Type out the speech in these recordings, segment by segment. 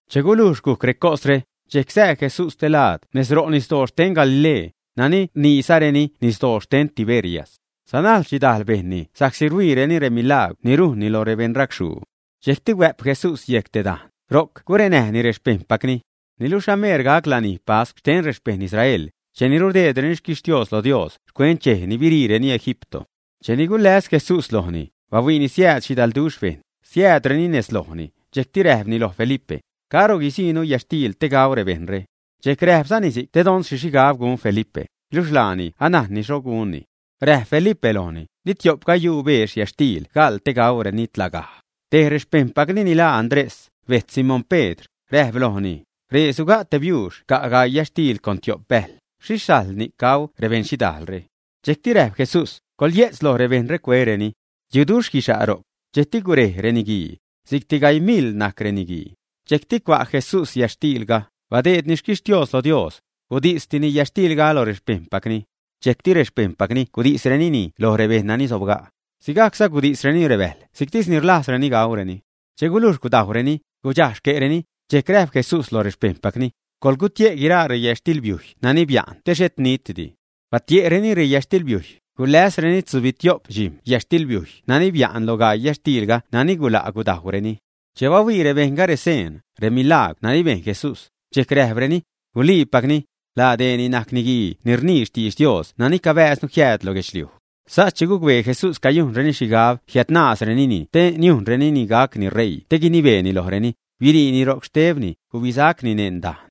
Che gulujx gujc recosre, dxejc sää Jesús stelaad nezro' nisdoo xten Galilee, nani rniizareni nisdoo xten Tiberias. Sanajl xhidajl bejṉni sa'csi rhuiireni remilagwr ni rujnni lo rebeṉracxhuu. Dxejcti huä'p Jesús yejc te dajn, ro'c gurenäjni rexpejṉpacni. Niluxh ameer gac lanij pascw xten rexpejṉ Israel, cheni rudeedreni xquixhtios lo Dios xcuent dxej ni biriireni Egipto. Cheni guläs Jesús lojni, bahuiini siääd xhidalduxh bejṉ, siäädreni nez lojni, dxejcti räjpni loj Felipe: ―¿Caro guisiinu yätxtiil te gau rebejṉre? Dxejc räjpzani si'c te don xhi xhigab gun Felipe, luxh laani anajnni xho gunni. Räjp Felipe lojni: ―Di tio'p gayuu beex yätxtiil gaḻ te gaureni tlagaj. Tej rexpejṉpacni ni laa Andrés, bejtz Simón Pedr, räjp lojni: ―Ree suga' te biuux ca' gaii yätxtiil con tio'p bäjl, ¿xhixh sajl ni'c gau rebeṉ xhidajlre? Dxejcti räjp Jesús: ―Coḻyejtz loj rebejṉre cuereni. Yuduxh guixa' ro'c. Dxejcti gurej reniguii. Si'cti gaii miḻ najc reniguii. Dxejcti cua' Jesús yätxtiilga, badeedni xquixtios lo Dios, gudisni yätxtiilga lo rexpejṉpacni. Dxejcti rexpejṉpacni gudisrenini loj rebejṉ nani sobga'. Sigajcza gudisreni rebäjl si'ctisni rlajzreni gaureni. Che gulujx gudajwreni, gudxaj xque'reni, dxejcti räjp Jesús loj rexpejṉpacni: ―Coḻgutie' guiraa reyätxtilbiujy nani bia'n te xhet nitdi. Batie'tireni reyätxtilbiujy, guläsreni tzubitio'p dxijm̲ yätxtilbiujy nani bia'n lo gaii yätxtiilga nani gula' gudajwreni. Che bahuii rebejṉga reseen, remilagwr nani bejn Jesús, dxejc räjpreni: ―Guluiipacni, laa dee ni najc niguii ni rnii xtidx Dios nani cabääznu jiääd lo guedxliuj. Sas che gucbee Jesús cayujnreni xhigab jiädnaazrenini te niujnreni gacni ṟeii te guinibeeni lojreni, biriini ro'c, xtebni gubisacni neṉ dajn.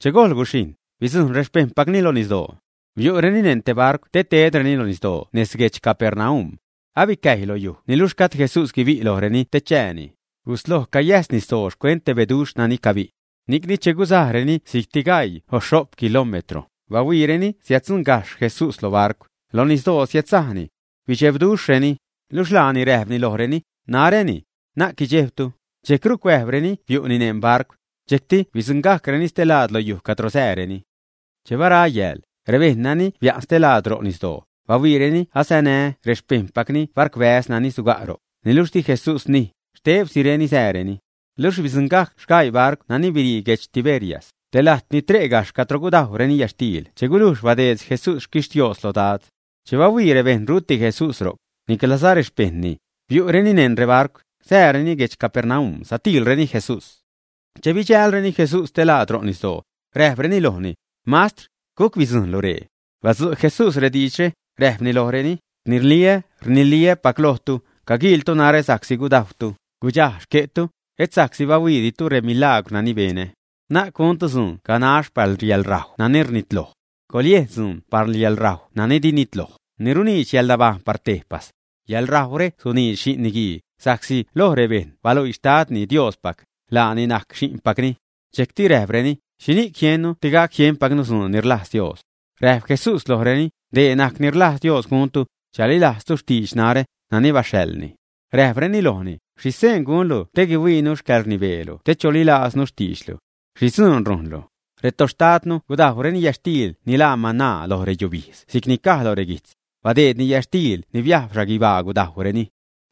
Che gojl guxhijṉ, bidzujṉ rexpejṉpacni lo nisdoo. Biu'reni neṉ te barcw te tedreni lo nisdoo nez guedx Capernaum. Abicäjy lo yuj niluxh gajd Jesús guibi' lojreni te chääni. Gusloj cayäjs nisdoo xcuent te beduxh nani cabi'. Ni'cni che gusajreni si'cti gaii o xho'p kilómetro, bahuiireni siäddzuṉgajxh Jesús lo barcw, lo nisdoo siädsajni. Bidxebduxhreni. Luxh laani räjpni lojreni: ―Naräni. Na'c guidxejbtu. Dxejcru cuäjbreni biu'ni neṉ barcw. Dxejcti bidzuṉgajcreni stelaad lo yuj cadro sääreni. Che bara yääl, rebejṉ nani bia'n stelaad ro' nisdoo, bahuiireni asanä rexpejṉpacni barcwbäz nani suga' ro'c, niluxh di Jesús nij, xtebsireni sääreni. Luxh bidzuṉgajc sgaii barcw nani birii guedx Tiberias, te lajt ni tre' gajxh cadro gudajwreni yätxtiil che gulujx badeed Jesús xquixtios lo Dad. Che bahuii rebejṉ ruti Jesús ro'c, niclaza rexpejṉni, biu'reni neṉ rebarcw, sääreni guedx Capernaum satiilreni Jesús. Che bidxälreni Jesús stelaad ro' nisdoo, räjpreni lojni: ―Mastr, ¿guc bidzujṉlu ree? Badzu' Jesús diidxre, räjpni lojreni: ―Rniliä́, rniliä́pac lojtu, caguiiltu narä sa'csi gudajwtu, gudxaj xque'tu, et sa'csi bahuiiditu remilagwr nani benä. Na'c guntu dzuun ganax par yäḻrajw nani rnitloj. Coḻyejn dzuun par yäḻrajw nani di nitloj, ni runiidx yäḻnabajṉ par tejpas. Yaḻrajwre suniidx Xi'n Niguii, sa'csi loj rebejṉ baluii Xtadni, Diospac, laani najc Xi'npacni. Dxejcti räjpreni: ―¿Xhini'c jiennu te gac jienpacnu dzuun ni rlajz Dios? Räjp Jesús lojreni: ―Dee najc ni rlajz Dios guntu: chalilajztu xtidx narä, nani baxhaḻni. Räjpreni lojni: ―¿Xhi seen gunlu te guihuiinu xcäḻrnibeelu te cholilajznu xtiidxlu? ¿Xhi dzuun rujnlu? Retoxtadnu gudajwreni yätxtiil ni laa mana loj reyubijdz si'cni caj loj reguijtz: “Badeedni yätxtiil ni biajb xhaguibaa gudajwreni.”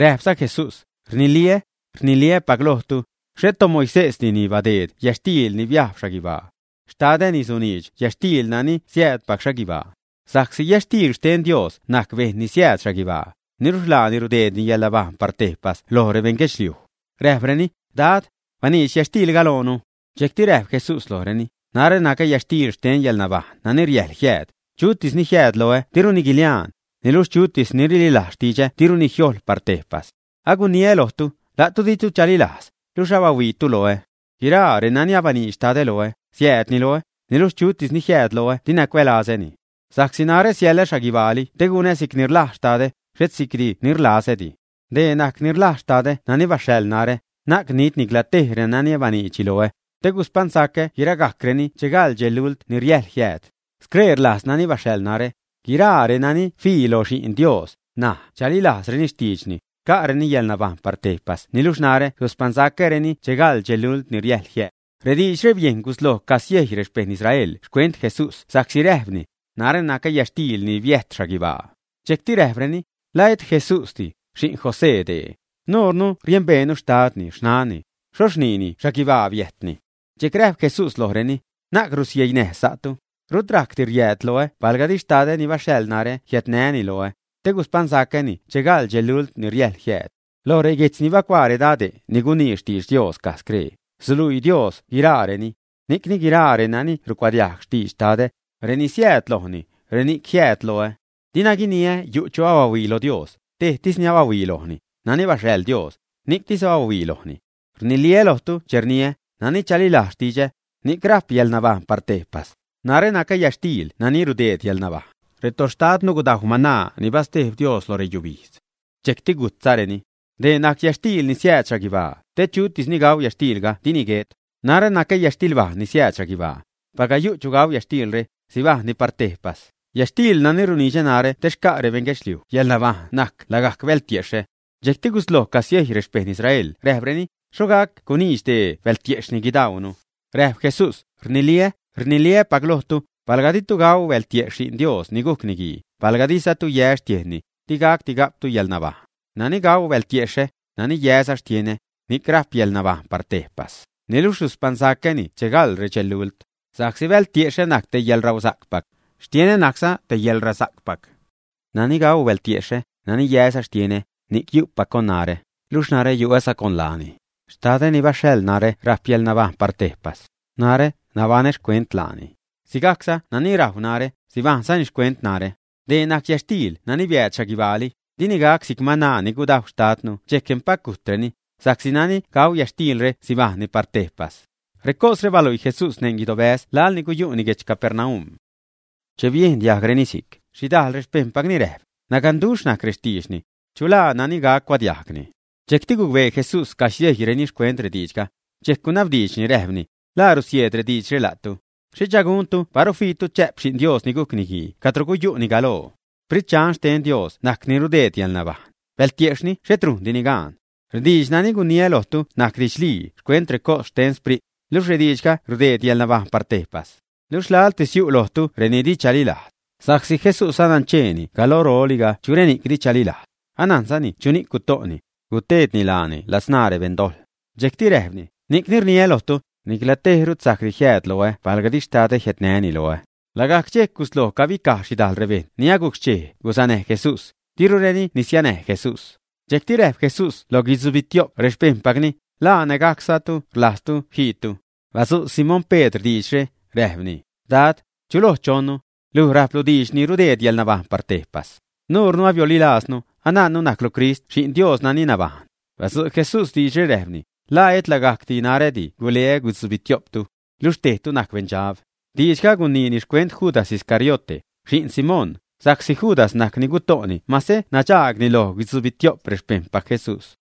Räjpza Jesús: ―Rniliä́, rniliä́pac lojtu, xhet toMoisésdi ni badeed yätxtiil ni biajb xhaguibaa. Xtadä ni suniidx yätxtiil nani siäädpac xhaguibaa. Sa'csi yätxtiil xten Dios najc bejṉ ni siääd xhaguibaa, niluxh laani rudeedni yäḻnabajṉ par tejpas loj rebeṉ guedxliuj. Räjpreni: ―Dad, baniidx yätxtiilga loonu. Dxejcti räjp Jesús lojreni: ―Narä nacä yätxtiil xten yäḻnabajṉ nani riäjḻ jiääd; chutis ni jiääd loä diruni guiliaan, niluxh chutis ni rililajz xtidxä diruni jiojḻ par tejpas. Aguniä lojtu, la'tu ditu chalilajz, luxh abahuiitu loä. Guiraa renani abaniidx Xtadä loä, siäädni loä, niluxh chutis ni jiääd loä dina cuälazäni. Sa'csi narä siälä xhaguibaali te gunä si'c ni rlajz Xtadä, xhet si'cdi ni rlazädi. Dee najc ni rlajz Xtadä nani baxhaḻ narä: na'c nit nicla tej renani baniidxni loä, te guspaṉsacä guiragajcreni che gaḻ dxej lult ni riäjḻ jiääd. Scree rlajz nani baxhaḻ narä: guiraa renani fii lo Xi'n Dios, näj chalilajzreni xtiidxni, xca'reni yäḻnabajṉ par tejpas niluxh narä suspaṉsacäreni che gaḻ dxej lult ni riäjḻ jiääd. Rediidxre bejn gusloj casiejy rexpejṉ Israel xcuent Jesús sa'csi räjpni: “Narä nacä yätxtiil ni biäjt xhaguibaa.” Dxejcti räjpreni: ―¿La et Jesúsdi, xi'n José dee, ä? Nuure numbeenu xtadni, xnanni, ¿xhoxh rniini xhaguibaa biäjtni? Dxejc räjp Jesús lojreni: ―Na'c rusieinäj sa'tu. Rut rajcdi riääd loä palga di Xtadä ni baxhaḻ narä jiädnäni loä, te guspaṉsacäni che gaḻ dxej lult ni riäjḻ jiääd. Loj reguijtz ni bacuaa redade' ni gunii xtidx Dios caj scree: “Suluii Dios guiraareni.” Ni'cni guiraa reni rucuadiajg xtidx Xtadä, reni rsieed lojni, reni'c ni jiääd loä. ’Dinä guiniä yu' chu abahuii lo Dios; tejtis ni abahuii lojni: nani baxhaḻ Dios, ni'ctis abahuii lojni. Rniliä lojtu che rniä: nani chalilajz xtidxä, ni'c rajp yäḻnabajṉ par tejpas. Narä nacä yätxtiil nani rudeed yäḻnabajṉ. Retoxtadtu gudajw mana ni bastejb Dios lo reyubijdz, dxejcti gujtzareni. Dee najc yätxtiil ni siääd xhaguibaa, te chutis ni gau yätxtiilga dini guet. Narä nacä yätxtilbajṉ ni siääd xhaguibaa. Palga yu' chu gau yätxtiilre, sibajṉni par tejpas. Yätxtiil nani runidxä narä te xca' rebeṉ guedxliuj yäḻnabajṉ najc lagajc bältiexhä. Dxejcti gusloj casiejy rexpejṉ Israel räjpreni: ―¿Xho gac guniidx dee bältiejxhni guidauunu, ä? Räjp Jesús: ―Rniliä́, rniliä́pac lojtu, palga ditu gau bältiejxh Xi'n Dios ni gujc Niguii, palga dizatu yä xtiejnni, digacdi ga'ptu yäḻnabajṉ. Nani gau bältiexhä, nani yäza xtienä, ni'c rajp yäḻnabajṉ par tejpas, niluxh suspaṉsacäni che gaḻ redxej lult. Sa'csi bältiexhä najc te yäḻrausa'cpac, xtienä najcza te yäḻräsa'cpac. Nani gau bältiexhä, nani yäza xtienä, ni'c yu'pac con narä, luxh narä yu'äza con laani. Xtadä ni baxhaḻ narä rajp yäḻnabajṉ par tejpas. Narä nabaṉä xcuent laani. Sigajcza nani rajw narä, sibajṉzani xcuent narä. Dee najc yätxtiil nani biääd xhaguibaali; dini gac si'c mana ni gudajw xtadtu dxejc empac gujtreni, sa'csi nani gau yätxtiilre sibajṉni par tejpas. Recosre baluii Jesús neṉ te guidobäz laḻ ni guyu'ni guedx Capernaum. Che biejn diajgreni si'c, xhidajl rexpejṉpacni räjp: ―Naganduxh najc rextiidxni. ¿Chu laa nani gac cuadiajgni? Dxejcti gucbee Jesús cagusiejyreni xcuent rediidxga, dxejc gunabdiidxni räjpni: ―¿La rusieed rediidxre la'tu, ä? ¿Xhicha guntu paru fiitu chä'p Xi'n Dios ni gujc Niguii cadro guyu'ni galoo? Sprit xten Dios najc ni rudeed yäḻnabajṉ; bältiejxhni xhet rujndini gaan. Rediidx nani guniä lojtu najc didxlii xcuent recos xten Sprit, luxh rediidxga rudeed yäḻnabajṉ par tejpas. Luxh laḻtis yu' lojtu reni di chalilajz. Sa'csi Jesús nancheeni galooli chu reni'c di chalilajz, anajnzani chuni'c guto'ni, guteedni laani ladzṉaa rebeṉ dojḻ. Dxejcti räjpni: ―Ni'cni rniä lojtu, nicla tej rut sajcdi jiääd loä palga di Xtadä jiädnäni loä. Lagajc dxejc gusloj cabicaj xhidajl rebejṉ ni agujc xchej gusanäj Jesús, dirureni nisianäj Jesús. Dxejcti räjp Jesús loj guidzubitio'p rexpejṉpacni: ―¿La nägajcza la'tu rlajztu jiitu, ä? Badzu' Simón Pedr diidxre, räjpni: ―Dad, ¿chuloj chonnu? Luj rajplu diidx ni rudeed yäḻnabajṉ par tejpas. Nuure abiolilaaznu, anajnnu najclu Crist Xi'n Dios nani nabajṉ. Badzu' Jesús diidxre, räjpni: ―¿La et lagajc narädi guleä guitzubitio'ptu? Luxh tejtu najc beṉdxab. Diidxga guniini xcuent Judas Iscariote, xi'n Simón, sa'csi Judas najc ni guto'ni mase nadxaagni lo guitzubitio'p rexpejṉpac Jesús.